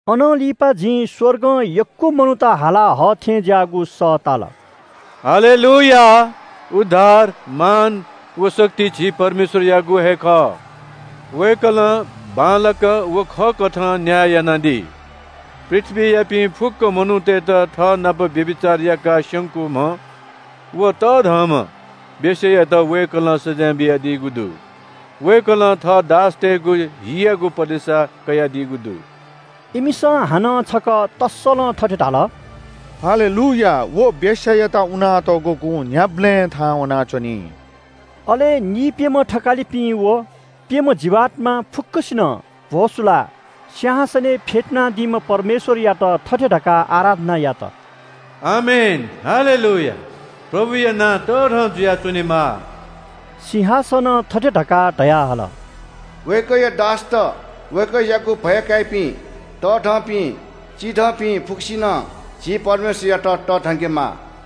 अनं लिपा जिं स्‍वर्गं यक्‍व मनूत हाला हःथेंज्‍याःगु सः ताल, “हल्‍लेलूयाह, उद्धार, मान व शक्ति झी परमेश्‍वरयागु हे खः। वय्‌कलं बांलाक व खःकथं न्‍याय यानादी। पृथ्‍वीयापिं फुक्‍क मनूतय्‌त थःनाप व्‍यभिचार याकाः स्‍यंकूम्‍ह व तःधंम्‍ह वेश्‍यायात वय्‌कलं सजाँय बियादीगु दु। वय्‌कलं थः दासतय्‌गु हियागु पलेसा कयादीगु दु।” इमिसं हानं छकः तसलं थथे धाल – “हल्‍लेलूयाह, व वेश्‍यायात उनातःगु कुँ न्‍ह्याबलें थाहां वनाच्‍वनी।” अले नीप्‍यम्‍ह थकालिपिं व प्‍यम्‍ह जीवात्‍मा फुक्‍कसिनं भ्‍वसुलाः सिंहासनय् फ्‍यतुनादीम्‍ह परमेश्‍वरयात थथे धकाः आराधना यात – “आमेन, हल्‍लेलूयाह। प्रभुयागु नां तःधं जुयाच्‍वनेमा।” सिंहासनं थथे धकाः धयाहल – “वय्‌कःया दासत, वय्‌कःयागु भय काइपिं, तःधंपिं, चिधंपिं फुक्‍कसिनं, झी परमेश्‍वरयात तःधंकेमाः।”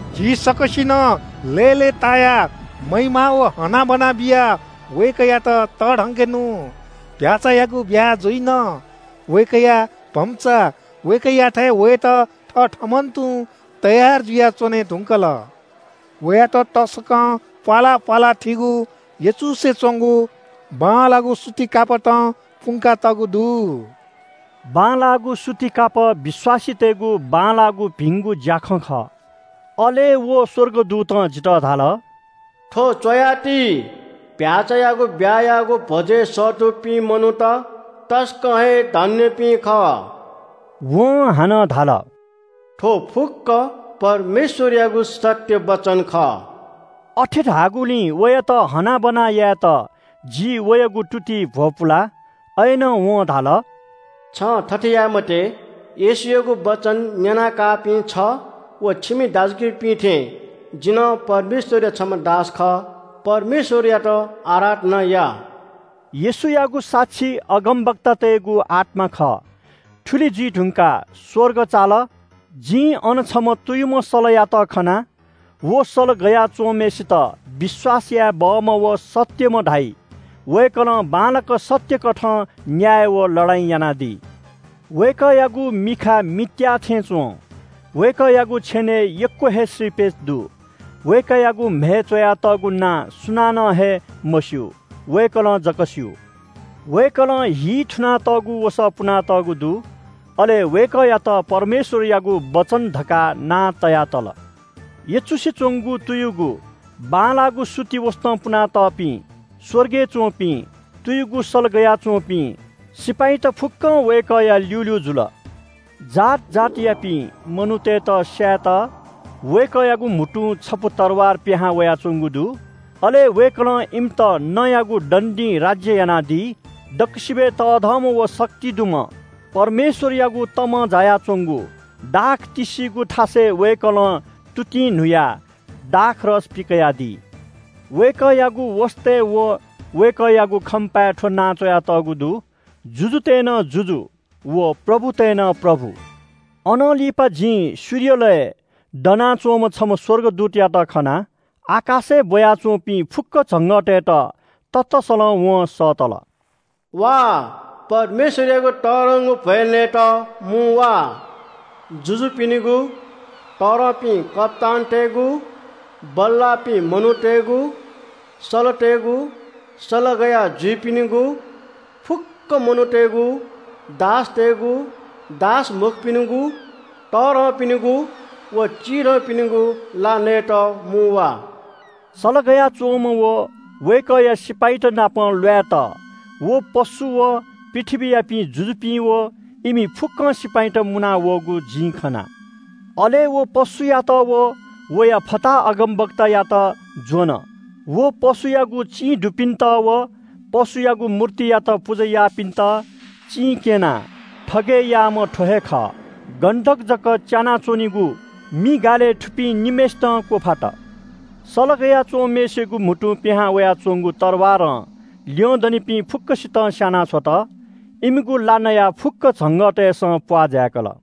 झी सकसिनं लय्‌लय्‌तायाः महिमा व हनाबना बियाः वय्‌कःयात तःधंके नु। चीधिकःम्‍ह भ्‍याःचायागु ब्‍याहा जुइन। वय्‌कःया भम्‍चा वय्‌कःयाथाय् वयेत थथःम्‍हं तुं तयार जुयाच्‍वने धुंकल। वयात तसकं प्‍वाला प्‍वाला थीगु, यचुसे च्‍वंगु, बांलाःगु सुति कापतं पुंका तःगु दु।” (बांलाःगु सूती कापः विश्‍वासीतय्‌गु बांलाःगु भिंगु ज्‍याखँ खः।) अले व स्‍वर्गदूतं जितः धाल – “थ्‍व च्‍वयाति, चीधिकःम्‍ह भ्‍याःचायागु ब्‍याहायागु भ्‍वजय् सःतूपिं मनूत तसकं हे धन्‍यपिं खः।” वं हानं धाल – “थ्‍व फुक्‍क परमेश्‍वरयागु सत्‍य वचन खः।” अथे धाःगुलिं वयात हनाबना यायेत जि वयागु तुतिइ भ्‍वपुला। अय्‌नं वं धाल – “छं थथे याये मते। येशूयागु वचन न्‍यनाकाःपिं छ व छिमि दाजुकिजापिं थें जि नं परमेश्‍वरया छम्‍ह दास खः। परमेश्‍वरयात आराधना या।” येशूयागु साक्षी अगमवक्तातय्‌गु आत्‍मा खः। थुलि जुइ धुंकाः स्‍वर्ग चाल, जिं अन छम्‍ह तुयुम्‍ह सलयात खना। व सल गया च्‍वंम्‍हय्‌सित विश्‍वास याये बहःम्‍ह व सत्‍यम्‍ह धाइ। वय्‌कलं बांलाक सत्‍य कथं न्‍याय व लडाइँ यानादी। वय्‌कःयागु मिखा मित्‍याः थें च्‍वं। वय्‌कःयागु छेनय् यक्‍व हे श्रीपेच दु। वय्‌कःयागु म्‍हय् च्‍वयातःगु नां सुनानं हे मस्‍यू, वय्‌कलं जक स्‍यू। वय्‌कलं हिइ थुनातःगु वसः पुनातःगु दु। अले वय्‌कःयात परमेश्‍वरयागु वचन धकाः नां तया तल। यचुसे च्‍वंगु, तुयुगु, बांलाःगु सुति वसतं पुनातःपिं स्‍वर्गय् च्‍वंपिं तुयुगु सल गया च्‍वंपिं सिपाइँत फुक्‍कं वय्‌कःया ल्‍यूल्‍यू जुल। जात जातियापिं मनूतय्‌त स्‍यायेत वय्‌कःयागु म्‍हुतुं छपु तरवार पिहां वयाच्‍वंगु दु। अले वय्‌कलं इमित नँयागु दण्‍डीं राज्‍य यानादी। दक्‍वसिबय् तःधंम्‍ह व शक्ति दुम्‍ह परमेश्‍वरयागु तमं जायाच्‍वंगु दाख तिस्‍सिगु थासय् वय्‌कलं तुतिं न्‍हुयाः दाखरस पिकयादी। वय्‌कःयागु वसतय् व वय्‌कःयागु खम्‍पाय् थ्‍व नां च्‍वयातःगु दु – “जुजुतय् नं जुजु व प्रभुतय् नं प्रभु।” अनं लिपा जिं सूर्यलय् दनाच्‍वंम्‍ह छम्‍ह स्‍वर्गदूतयात खना। आकाशय् ब्‍वया च्‍वंपिं फुक्‍क झंगःतय्‌त ततसलं वं सःतल – “वा, परमेश्‍वरयागु तःधंगु भ्‍वय् नयेत मुं वा। जुजुपिनिगु, तःधंपिं कप्‍तानतय्‌गु, बल्‍लाःपिं मनूतय्‌गु, सलतय्‌गु, सल गया जुइपिनिगु, फुक्‍क मनूतय्‌गु, दासतय्‌गु, दास मखुपिनिगु, तःधंपिनिगु व चिधंपिनिगु ला नयेत मुं वा।” सल गया च्‍वंम्‍ह व वय्‌कःया सिपाइँत नाप ल्‍वायेत व पशु व पृथ्‍वीयापिं जुजुपिं व इमि फुक्‍कं सिपाइँत मुनावःगु जिं खना। अले व पशुयात व वया फताहा अगमवक्तायात ज्‍वन। व पशुयागु चिं दुपिन्‍त व पशुयागु मूर्तियात पुजा याःपिन्‍त चिं क्‍यनाः थगय् याःम्‍ह थ्‍व हे खः। गन्‍धक जक च्‍यानाच्‍वनीगु मि गालय् थुपिं निम्‍हय्‌सितं क्‍वफात। सल गया च्‍वंम्‍हय्‌सिगु म्‍हुतुं पिहां वयाच्‍वंगु तरवारं ल्‍यंदनिपिं फुक्‍कसितं स्‍याना छ्वत। इमिगु ला नयाः फुक्‍क झंगःतय्‌सं प्‍वाः जाय्‌कल।